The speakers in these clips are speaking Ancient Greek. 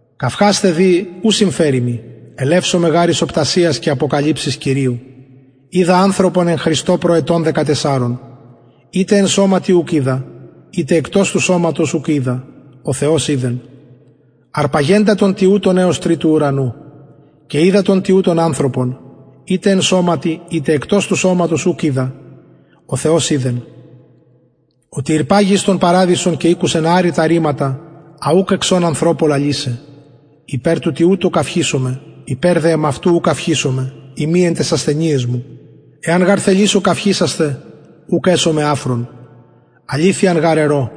καυχασθαι δη ου συμφερει μοι ελευσομαι γαρ εις οπτασιας και αποκαλυψεις κυριου οιδα ανθρωπον εν χριστω προ ετων δεκατεσσαρων ειτε εν σωματι ουκ οιδα ειτε εκτος του σωματος ουκ οιδα ο θεος οιδεν αρπαγεντα τον τοιουτον εως τριτου ουρανου και οιδα τον τοιουτον ανθρωπον ειτε εν σωματι ειτε εκτος του σωματος ουκ οιδα ο θεος οιδεν οτι ηρπαγη εις τον παραδεισον και ηκουσεν αρρητα ρηματα α ουκ εξον ανθρωπω λαλησαι υπερ του τοιουτου καυχησομαι υπερ δε εμαυτου ου καυχησομαι ει μη εν ταις ασθενειαις μου εαν γαρ θελησω καυχησασθαι ουκ εσομαι αφρων αληθειαν γαρ ερω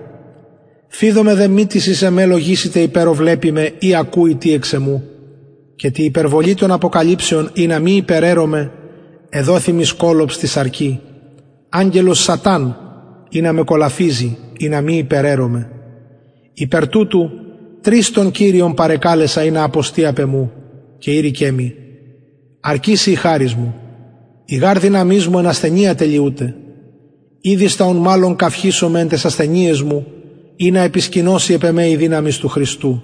φειδομαι δε μη τις εις εμε λογισηται υπερ ο βλεπει με η ακουει τι εξ εμου και τη υπερβολη των αποκαλυψεων ινα μη υπεραιρωμαι εδοθη μοι σκολοψ τη σαρκι αγγελος σαταν ινα με κολαφιζη ινα μη υπεραιρωμαι υπερ τουτου τρις τον κυριον παρεκαλεσα ινα αποστη απ εμου και ειρηκεν μοι αρκει σοι η χαρις μου η γαρ δυναμις μου εν ασθενεια τελειουται ηδιστα ουν μαλλον καυχησομαι εν ταις ασθενειαις μου ινα επισκηνωση επ εμε η δυναμις του χριστου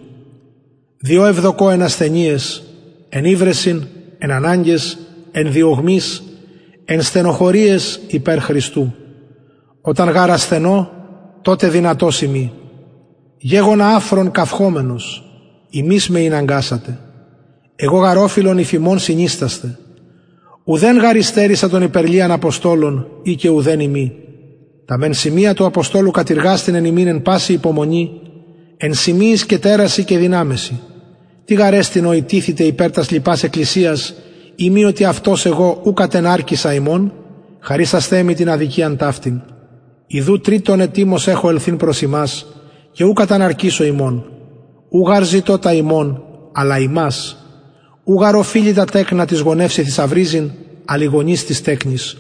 διο ευδοκω εν ασθενειαις εν υβρεσιν εν αναγκαις εν διωγμοις εν στενοχωριαις υπερ χριστου οταν γαρ ασθενω τοτε δυνατος ειμι γεγονα αφρων καυχωμενος υμεις με ηναγκασατε εγω γαρ ωφειλον υφ υμων συνιστασθαι ουδεν γαρ υστερησα των υπερ λιαν αποστολων ει και ουδεν ειμι τα μεν σημεια του αποστολου κατειργασθη εν υμιν εν παση υπομονη εν σημειοις και τερασιν και δυναμεσιν τι γαρ εστιν ο ηττηθητε υπερ τας λοιπας εκκλησιας ει μη οτι αυτος εγω ου κατεναρκησα υμων χαρισασθε μοι την αδικιαν ταυτην ιδου τριτον ετοιμως εχω ελθειν προς υμας και ου καταναρκησω υμων ου γαρ ζητω τα υμων αλλα υμας ου γαρ οφειλει τα τεκνα τοις γονευσιν θησαυριζειν αλλ οι γονεις τοις τεκνοις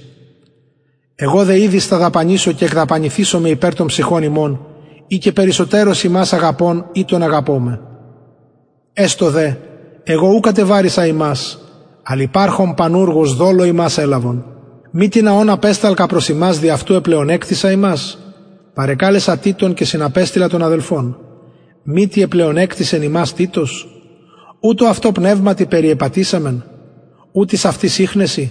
εγω δε ηδιστα δαπανησω και εκδαπανηθησομαι υπερ των ψυχων υμων ει και περισσοτερως υμας αγαπων ηττον αγαπωμαι εστω δε εγω ου κατεβαρησα υμας αλλ υπαρχων πανουργος δολω υμας ελαβον μη τινα ων απεσταλκα προς υμας δι αυτου επλεονεκτησα υμας παρεκαλεσα τιτον και συναπεστειλα τον αδελφον μη τι επλεονεκτησεν υμας τιτος ου τω αυτω πνευματι περιεπατησαμεν ου τοις αυτοις ιχνεσιν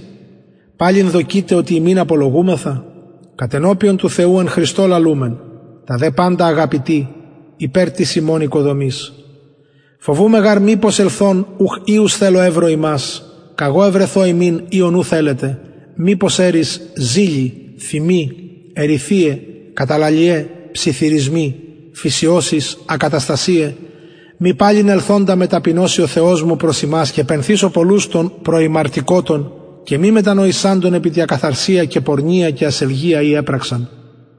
παλιν δοκειτε οτι υμιν απολογουμεθα κατενωπιον του θεου εν χριστω λαλουμεν τα δε παντα αγαπητοι υπερ της υμων οικοδομης φοβουμαι γαρ μηπως ελθων ουχ οιους θελω ευρω υμας καγω ευρεθω υμιν οιον ου θελετε μηπως ερεις ζηλοι θυμοι εριθειαι καταλαλιαι ψιθυρισμοι φυσιωσεις ακαταστασιαι μη παλιν ελθοντα με ταπεινωσει ο θεος μου προς υμας και πενθησω πολλους των προημαρτηκοτων και μη μετανοησαντων επι τη ακαθαρσια και πορνεια και ασελγεια η επραξαν